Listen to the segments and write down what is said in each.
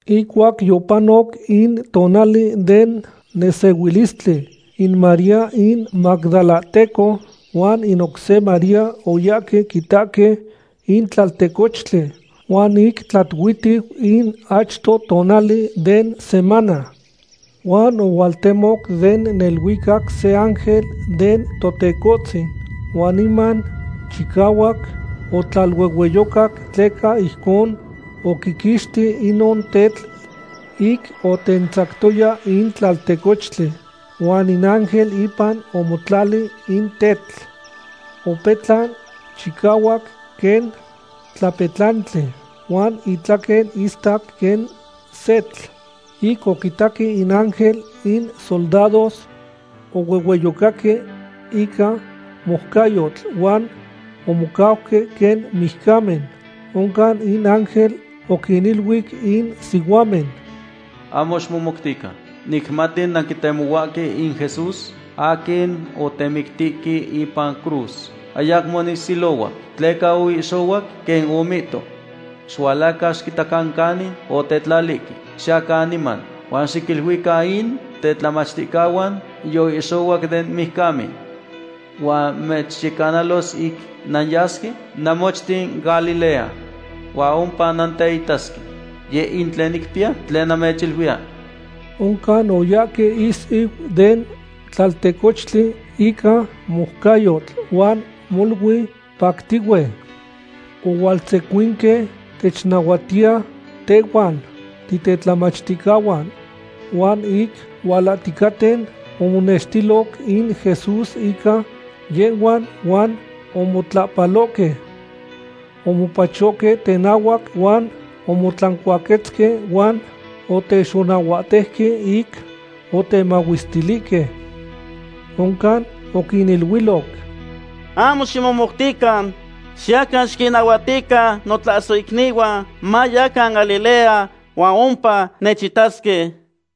Ihcuac yopanoc in tonali den nesehuilistli, in María in magdalahteco huan in oc se María oyahque quitahque in tlaltecochtli. Huan ic tlatuihtiu in achto tonali den semana. Huan ohualtemo den neluicac se ángel den Totecohtzin. Huan niman chicahuac otlaluehueyocac tleca ijcon oquiquixti inon tetl ic otentzactoya in tlaltecochtli. Huan in ángel ipan omotlali in tetl. Opetlan chicahuac quen tlapetlantli, huan itlaquen istac quen setl. Ic oquitaque in ángel, in soldados ohuehueyocaque ica moucayotl huan omocauque quen mijcamen. Oncan in ángel oquiniluic in sihuamen: ―Ahmo ximomoutican. Nicmati nantetemohuahque in Jesús aquin otemictihque ipan cruz. Ayacmo nis ilohuac, tleca oihxohuac, quen omihto. Xihualacan xiquitacan canin otetlalihque. Xiyacan niman huan xiquiniluican in tetlamachticahuan yoihxohuac den mijcamen. Huan mechyecanalos ic nanyasque namochten Galilea. Huan ompa nanteitasque. Yeh in tlen nicpiya tlen namechiluiya. Oncan oyahque ihsiu den tlaltecochtli ica moucayotl huan molui pactihue. Ohualtzecuinque technahuatiya tehhuan titetlamachticahuan. Huan ic hualahticaten, omonextiloc in Jesús ica yehhuan huan omotlapalohque. Omopachohque tenahuac huan omotlancuaquetzque huan otexonahuatejque ic otemahuestilihque. Oncan oquiniluiloc: ―Ahmo ximomoutican. Xiyacan xiquinnahuatican notlasohicnihuan mayacan Galilea huan ompa nechitasque.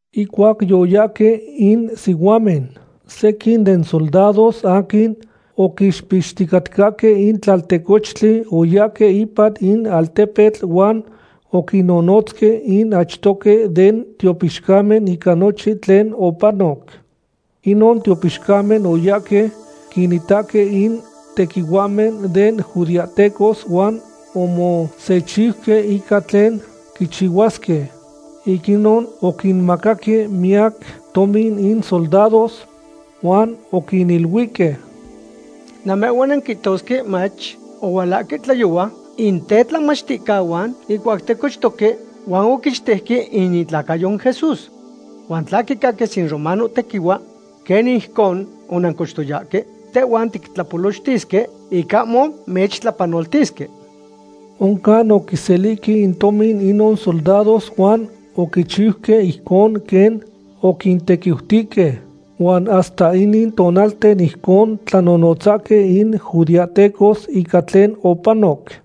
Ihcuac yoyahque in sihuamen, sequin den soldados aquin oquixpixticatcahque in tlaltecochtli oyahque ipan in altepetl huan oquinnonotzque in achtohque den tiopixcamen ica nochin tlen opanoc. Inon tiopixcamen oyahque quinitahque in tequihuahmen den judeahtecos huan omosechiuque ica tlen quichihuasque. Ic inon oquinmacaque miyac tomin in soldados. Huan oquiniluihque: ―Namehhuan nanquihtosque mach: “Ohualahque tlayohua in tetlamachticahuan ihcuac ticochtoque huan oquichtejque in itlacayo in Jesús.” Huan tla quicaquis in romanohtequihua quen ijcon onancochtoyahque, tehhuan tictlapolochtisque ic ahmo mechtlapanoltisque. Oncan oquiselihque in tomin inon soldados huan oquichiuque ijcon quen oquintequiutihque. Huan hasta inin tonalten ijcon tlanonotzahque in judeahtecos ica tlen opanoc.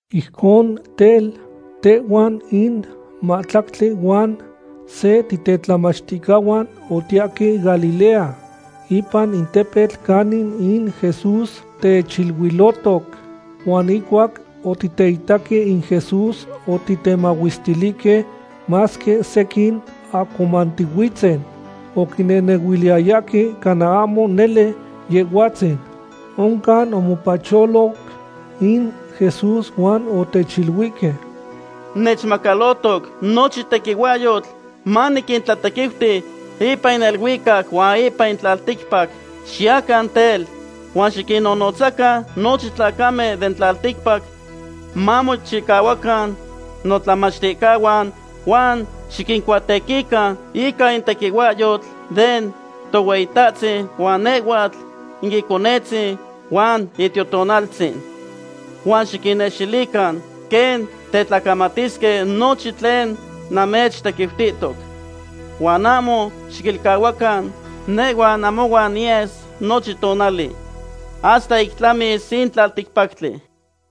Ijcon tel, tehhuan in mahtlactli huan se titetlamachticahuan otiyahque Galilea, ipan in tepetl canin in Jesús techiluilohtoc. Huan ihcuac otiteitaque in Jesús, otitemahuestilihque, masque sequin ahcomantihuitzen. Oquinehnehuiliyayahque cana ahmo nele Yehhuatzin. Oncan omopacholo in Jesús huan otechiluihque: ―Nechmacalohtoc nochin tequihuahyotl manitlatequiuti ipan in neluicac huan ipan in tlalticpac. Xiyacan tel, huan xiquinnonotzacan nochin tlacamen den tlalticpac mamochihuacan notlamachticahuan. Huan xiquincuatequican ica in tequihuahyotl den Tohueyitahtzin huan nehhuatl in Iconetzin huan in Itiotonaltzin. Huan xiquinnextilican quen tetlacamatisque nochin tlen namechtequiutihtoc. Huan ahmo xiquilcahuacan nehhua namohuan niyes nochin tonali, hasta ic tlamis in tlalticpactli.